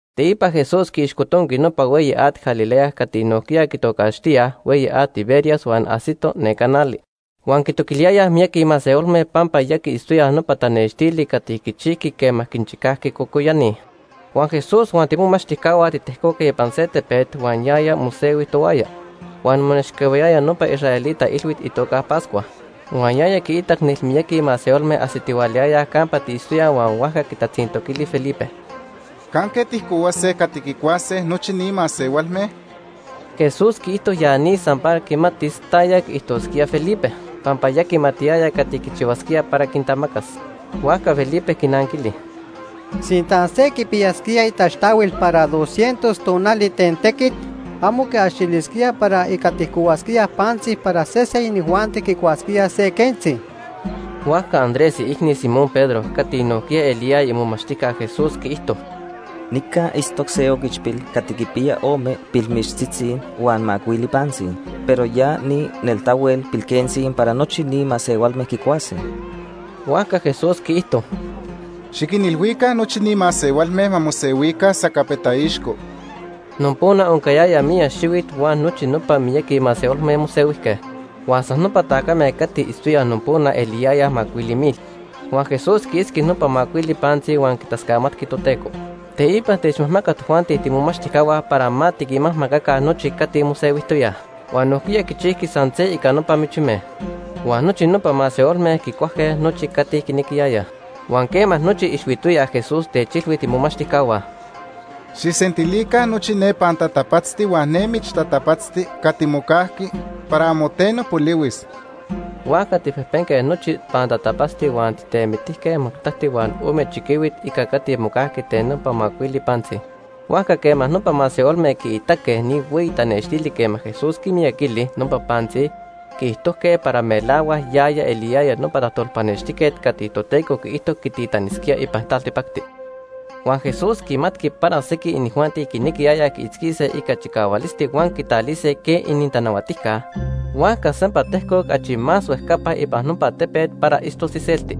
Teipa Jesús quiixcotonqui nopa Hueyi At Galilea cati nojquiya quitocaxtíaj Hueyi At Tiberias huan ajsito neca nali. Huan quitoquiliyayaj miyaqui masehualme pampa ya quiitztoyaj nopa tanextili cati quichijqui quema quinchicajqui cocoyani. Huan Jesús huan tiimomachtijcahua titejcoque ipan se tepet, huan yaya mosehui tohuaya. Huan monechcahuiyaya nopa israelita ilhuit itoca Pascua. Huan yaya quiitac nelmiyaqui masehualme ajsitihualayayaj campa tiitztoyaj huan huajca quitatzintoquili Felipe: ―¿Canque tijcohuase cati quicuase nochi ni masehualme? Jesús quiijto ya ni san para quimatis taya quiijtosquía Felipe, pampa ya quimatiyaya cati quichihuasquía para quintamacas. Huajca Felipe quinanquili: ―Sinta se quipiyasquía itaxtahuil para dos cientos tonali ten tequit, amo quiaxilisquía para ica tijcohuasquíaj pantzi para sese inijuanti quicuasquía se quentzi. Huajca Andrés, iicni Simón Pedro, cati nojquiya eliyaya imomachtijca Jesús quiijto: ―Nica itztoc se oquichpil cati quipiya ome pilmichtzitzi huan macuili pantzi, pero ya ni neltahuel pilquentzi para nochi ni masehualme quicuase. Huajca Jesús quiijto: ―Xiquinilhuica nochi ni masehualme ma mosehuica sacapeta ixco. Nopona oncayaya miyac xihuit huan nochi nopa miyaqui masehualme mosehuijque. Huan san nopa tacame cati itztoyaj nopona quiaxitijque macuili mil. Huan Jesús quiitzqui nopa macuili pantzi huan quitascamatqui Toteco. Teipa techmajmacac tojuanti tiimomachtijcahua para ma tiquinmajmacaca nochi cati mosehuijtoyaj. Huan nojquiya quichijqui san se ica nopa michime. Huan nochi nopa masehualme quicuajque nochi cati quinequiyayaj. Huan quema nochi ixhuitoyaj, Jesús techilhui tiimomachtijcahua: ―Xijsentilica nochi ne pantatapatzti huan ne michtatapatzti cati mocajqui para amo teno polihuis. Huajca tijpejpenque nochi pantatapatzti huan tijtemitijque majtacti huan ome chiquihuit ica cati mocajqui ten nopa macuili pantzi. Huajca quema nopa masehualme quiitaque ni hueyi tanextili quema Jesús quimiyaquili nopa pantzi, quiijtojque para melahuac yaya eliyaya nopa tajtolpanextijquet cati Toteco quiijto quititanisquía ipan taltipacti. Huan Jesús quimatqui para sequij inijuanti quinequiyayaj quiitzquise ica chicahualisti huan quitalise quej inintanahuatijca, huajca sempa tejcoc achi más huejcapa ipan nopa tepet para itztos iselti.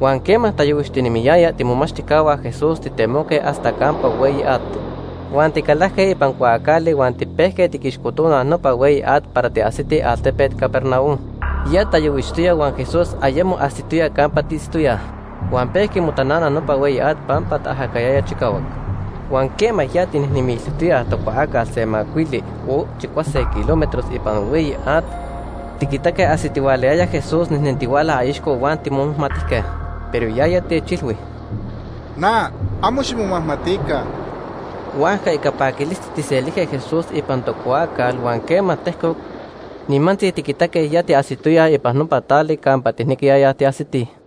Huan quema tayohuixtinemiyaya, tiimomachtijcahua Jesús titemoque hasta campa hueyi at, huan ticalajque ipan cuaacali huan tipejque tiquixcotonaj nopa hueyi at para tiajsitij altepet Capernaum. Ya tayohuixtoya huan Jesús ayemo ajsitoya campa tiitztoyaj, Huan pejqui motanana nopa hueyi at pampa taajacayaya chicahuac. Huan quema ya tijnejnemiltijtoyaj tocuaacal se macuili o chicuase kilómetros ipan hueyi at, tiquitaque ajsitihualayaya Jesús nejnentihuala aixco huan timomajmatijque. Pero yaya techilhui: ―Na, amo ximomajmatica. Huajca ica paquilisti tijselijque Jesús ipan tocuaacal huan quema tejcoc, nimantzi tiquitaque ya tiajsitoyaj ipan nopa tali campa tijnequiyayaj tiajsitij.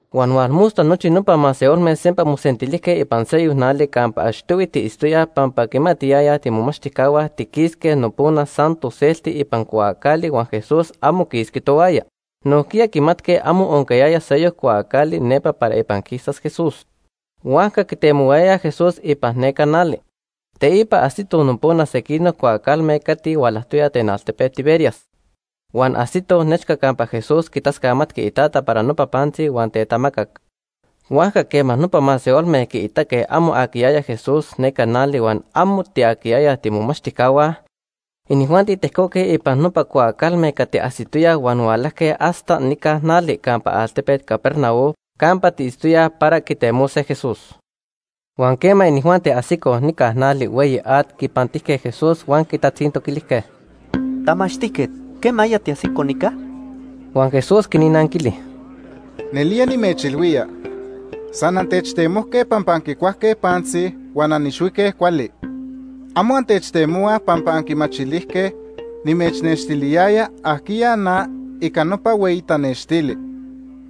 Huan hualmosta nochi nopa masehualme sempa mosentilijque ipan seyoc nali campa achtohui tiitztoyaj pampa quimatiyayaj tiimomachtijcahua tiquisque nopona san toselti ipan cuaacali huan Jesús amo quisqui tohuaya. Nojquiya quimatque amo oncayaya seyoc cuaacali nepa para ipan quisas Jesús. Huajca quitemohuayayaj Jesús ipan neca nali. Teipa ajsitoj nopona sequinoc cuaacalme cati hualajtoyaj ten altepet Tiberias. Huan ajsitoj nechca campa Jesús quitascamatqui iTata para nopa pantzi huan tetamacac. Huajca quema nopa masehualme quiitaque amo aquiyaya Jesús neca nali huan amo tiaquiyayaj tiimomachtijcahua, inijuanti tejcoque ipan nopa cuaacalme cati ajsitoyaj huan hualajque hasta nica nali campa altepet Capernaum campa tiitztoyaj para quitemose Jesús. Huan quema inijuanti ajsicoj nica nali hueyi at, quipantijque Jesús huan quitatzintoquilijque: ―Tamachtijquet, ¿quemaya tiajsico nica? Huan Jesús quinnanquili: ―Nelía nimechilhuía, san antechtemohuaj pampa anquicuajque pantzi huan anixhuique cuali. Amo antechtemohuaj pampa anquimachilijque nimechnextiliyaya ajquiya na ica nopa hueyi tanextili.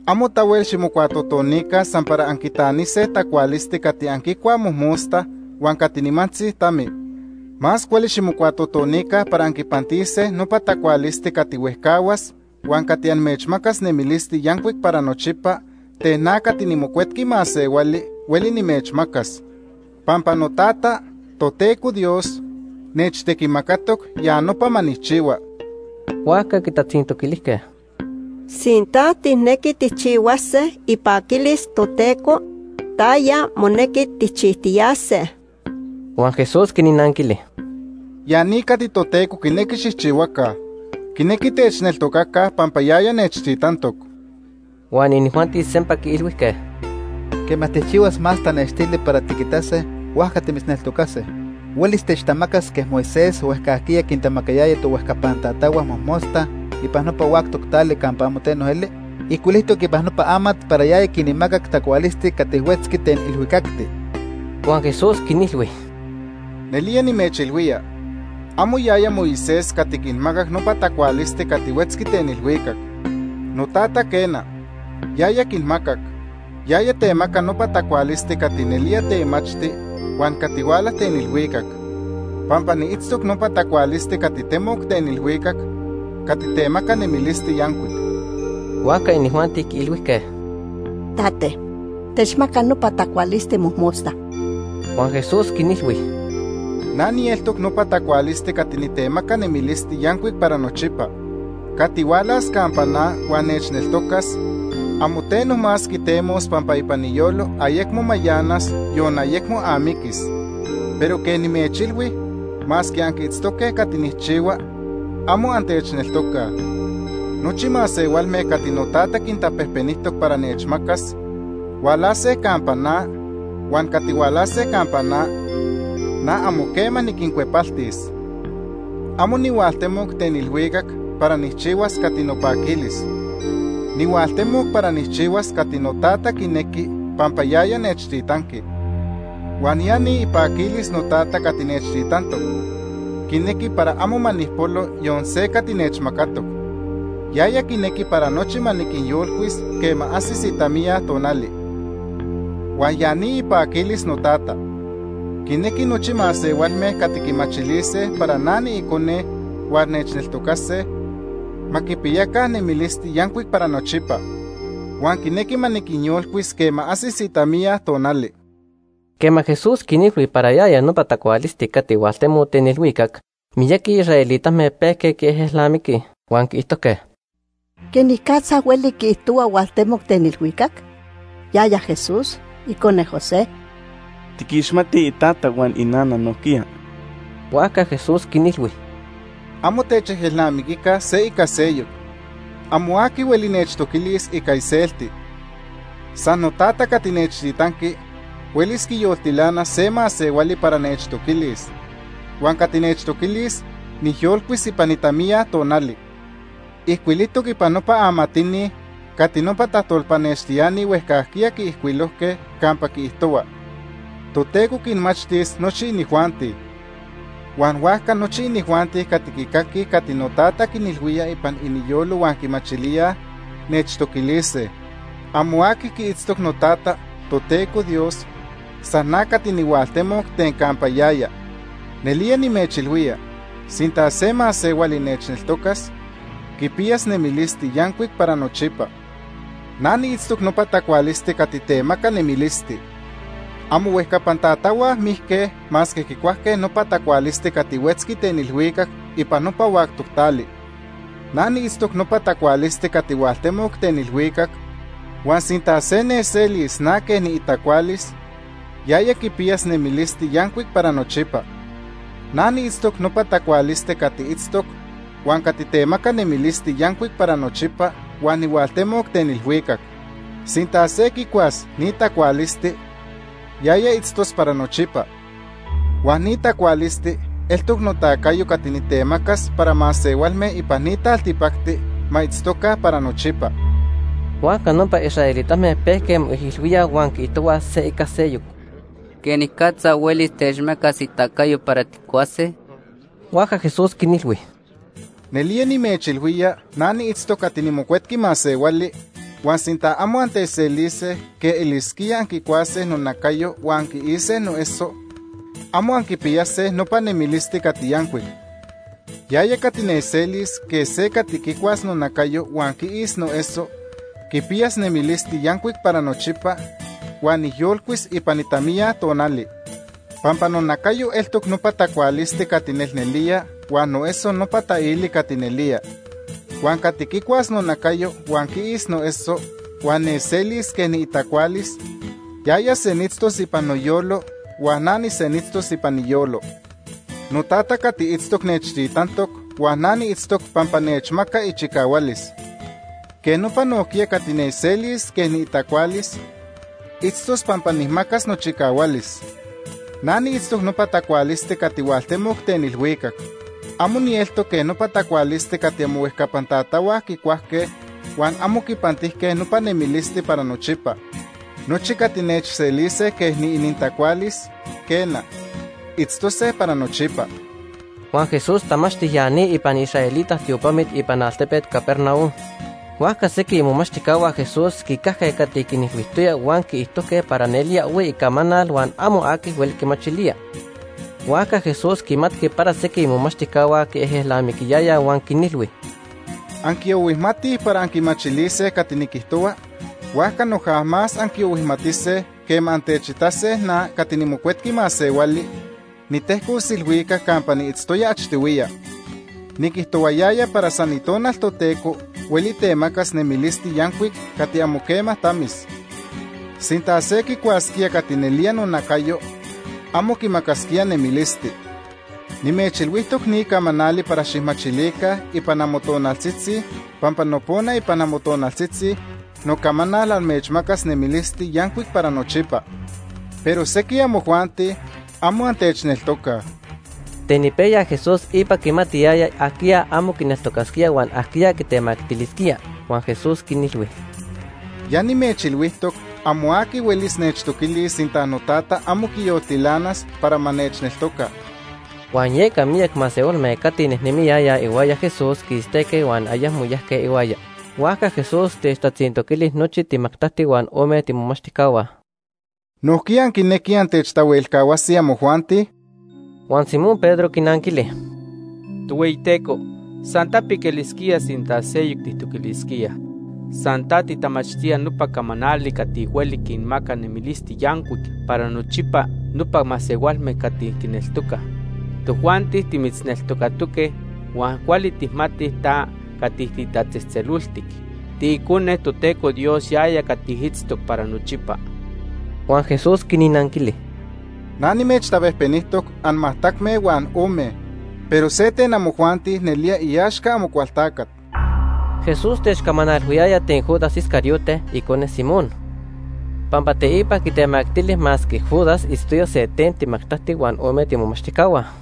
Amo tahuel ximocuatotonica san para anquitanise tacualisti cati anquicuaj mojmosta huan cati nimantzi tami. Más cuali ximocuatotonica para anquipantise nopa tacualisti cati huejcahuas huan cati amechmacas nemilisti yancuic para nochipa ten na cati niMocuetqui Masehuali hueli nimechmacas. Pampa noTata, Toteco Dios, nechtequimacatoc ya nopa ma nijchihua. Huajca quitatzintoquilijque: ―Sinta tijnequi tijchihuase ipaquilis Toteco, ¿taya monequi tijchijtiyase? Huan Jesús quinnanquili: ―Ya ni cati Toteco quinequi xijchihuaca. Quinequi techneltocaca pampa yaya nechtitantoc. Huan inijuanti sempa quiilhuijque: ―Quema tijchihuas más tanextili para tiquitase, huajca timitzneltocase. ¿Huelis techtamacas quej Moisés huejcajquiya quintamacayaya tohuejcapan tatahua mojmosta ipan nopa huactoc tali campa amo teno eli? Ijcuilijtoc ipan nopa amat para yaya quinmacac tacualisti cati huetzqui ten ilhuicacti. Huan Jesús quinilhui: ―Nelía nimechilhuía, amo yaya Moisés cati quinmacac nopa tacualisti cati huetzqui ten ilhuicacti. NoTata, quena, yaya quinmacac. Yaya temaca nopa tacualisti cati nelía temachti huan cati huala ten ilhuicac. Pampa niitztoc nopa tacualisti cati temoc ten ilhuicac cati temaca nemilisti yancuic. Huajca inijuanti quiilhuijque: ―Tate, techmaca nopa tacualisti mojmosta. Huan Jesús quinilhui: ―Na nieltoc nopa tacualisti cati nitemaca nemilisti yancuic para nochipa. Cati hualas campa na huan nechneltocas, amo teno más quitemos pampa ipan iyolo ayecmo mayanas, yon ayecmo amiquis. Pero quej nimechilhui, masque anquiitztoque cati nijchihua, amo antechneltocaj. Nochi masehualme cati noTata quintapejpenijtoc para nechmacas, hualase campa na, huan cati hualase campa na, na amo quema niquincuepaltis. Amo nihualtemoc ten ilhuicac para nijchihuas cati nopaquilis. Nihualtemoc para nijchihuas cati noTata quinequi pampa yaya nechtitanqui. Huan ya ni ipaquilis noTata cati nechtitantoc, quinequi para amo ma nijpolo yon se cati nechmacatoc. Yaya quinequi para nochi ma niquinyolcuis quema ajsis itamiya tonali. Huan ya ni ipaquilis noTata. Quinequi nochi masehualme cati quimachilise para na niIcone huan nechneltocase, ma quipiyaca nemilisti yancuic para nochipa. Huan quinequi ma niquinyolcuis quema ajsis itamiya tonali. Quema Jesús quinilhui para yaya nopa tacualisti cati hualtemoc ten ilhuicac, miyaqui israelitame pejque quiejelnamiquij. Huan quiijtojque: ―¿Quenicatza hueli quiijtohua hualtemoc ten ilhuicac? Yaya Jesús, icone José. Tiquixmatij itata huan inana nojquiya. Huajca Jesús quinilhui: ―Amo techejelnamiquica se ica seyoc. Amo aqui hueli nechtoquilis ica iselti. San noTata cati nechtitanqui huelis quiyoltilanas se masehuali para nechtoquilis, huan cati nechtoquilis nijyolcuis ipan itamiya tonali. Ijcuilijtoc ipan nopa amatini cati nopa tajtolpanextiani huejcajquiya quiijcuilojque campa quiijtohua: ‘Toteco quinmachtis nochi inijuanti.’ Huan huajca nochi inijuanti cati quicaquij cati noTata quinilhuía ipan iniyolo huan quimachilíaj, nechtoquilise. “Amo aqui quiitztoc noTata, Toteco Dios, san na cati nihualtemoc ten campa yaya. Nelía nimechilhuía, sinta se masehuali nechneltocas, quipiyas nemilisti yancuic para nochipa. Na niitztoc nopa tacualisti cati temaca nemilisti. Amohuejcapan tatahua mijque masque quicuajque nopa tacualisti cati huetzqui ten ilhuicac ipan nopa huactoc tali. Na niitztoc nopa tacualisti cati hualtemoc ten ilhuicac huan sinta se nechselis na quej niitacualis, yaya quipiyas nemilisti yancuic para nochipa. Na niitztoc nopa tacualisti cati itztoc huan cati temaca nemilisti yancuic para nochipa huan nihualtemoc ten ilhuicac. Sinta se quicuas ni tacualisti, yaya itztos para nochipa. Huan ni tacualisti eltoc notacayo cati nitemacas para masehualme ipan ni taltipacti ma itztoca para nochipa.” Huajca nopa israelitame pejque moijilhuíaj huan quiijtohuaj se ica seyoc: ―¿Quenicatza huelis techmacas itacayo para tijcuase? Huajca Jesús quinilhui: ―Nelía nimechilhuía na niitztoc cati niMocuetqui Masehuali, huan sinta amo antechselise quej elisquía anquicuase nonacayo huan anquiise noeso, amo anquipiyase nopa nemilisti cati yancuic. Yaya cati nechselis quej se cati quicuas nonacayo huan quiis noeso quipiyas nemilisti yancuic para nochipa huan nijyolcuis ipan itamiya tonali. Pampa nonacayo eltoc nopa tacualisti cati nelnelía huan noeso nopa taili cati nelía. Huan cati quicuas nonacayo huan quiis noeso huan nechselis quej niitacualis, yaya senitztos ipan noyolo huan na nisenitztos ipan iyolo. NoTata cati itztoc nechtitantoc huan na niitztoc pampa nechmaca ichicahualis. Quej nopa nojquiya cati nechselis quej niitacualis, itztos pampa nijmacas nochicahualis. Na niitztoc nopa tacualisti cati hualtemoc ten ilhuicac. Amo nieltoc quej nopa tacualisti cati amohuejcapan tatahua quicuajque huan amo quipantijque nopa nemilisti para nochipa. Nochi cati nechselise quej niinintacualis, quena, itztose para nochipa. Huan Jesús tamachti ya ni ipan israelita tiopamit ipan altepet Capernaum. Huajca sequij imomachtijcahua Jesús quicajque cati quinilhuijtoya, huan quiijtojque para nelía ohui icamanal huan amo aqui hueli quimachilía. Huajca Jesús quimatqui para sequij imomachtijcahua quiejelnamiquiyayaj huan quinilhui: ―¿Anquiohuijmatij para anquimachilise cati niquijtohua? Huajca noja más anquiohuijmatise quema antechitase na, cati niMocuetqui Masehuali, nitejcos ilhuicac campa niitztoya achtohuiya. Niquijtohuayaya para san Itonal Toteco hueli temacas nemilisti yancuic cati amo quema tamis. Sinta se quicuasquía cati nelía nonacayo amo quimacasquía nemilisti. Nimechilhuijtoc ni camanali para xijmachilica ipan amotonaltzitzi pampa nopona ipan amotonaltzitzi nocamanal amechmacas nemilisti yancuic para nochipa. Pero sequij amojuanti amo antechneltocaj. Ten ipejya Jesús ipa quimatiyaya ajquiya amo quineltocasquía huan ajquiya quitemactilisquía. Huan Jesús quinilhui: ―Ya nimechilhuijtoc amo aqui huelis nechtoquilis sinta noTata amo quiyoltilanas para ma nechneltoca. Huan yeca miyac masehualme cati nejnemiyayaj ihuaya Jesús quistejque huan ayecmo yajque ihuaya. Huajca Jesús techtatzintoquili nochi timajtacti huan ome tiimomachtijcahua: ―¿Nojquiya anquinequij antechtahuelcahuase amojuanti? Huan Simón Pedro quinanquili: ―Tohueyiteco, san tapic elisquía sinta seyoc tijtoquilisquíaj. San ta titamachtía nopa camanali cati hueli quinmaca nemilisti yancuic para nochipa nopa masehualme cati quineltocaj. Tojuanti timitzneltocatoque huan cuali tijmatij ta cati titatzejtzeloltic. TiIcone Toteco Dios yaya cati itztoc para nochipa. Huan Jesús quinnanquili: ―Na nimechtapejpenijtoc anmajtacme huan ome, pero se ten amojuanti nelía iaxca Amocualtacat. Jesús techcamanalhuiyaya ten Judas Iscariote, icone Simón, pampa teipa quitemactili masque Judas itztoya se ten timajtacti huan ome tiimomachtijcahua.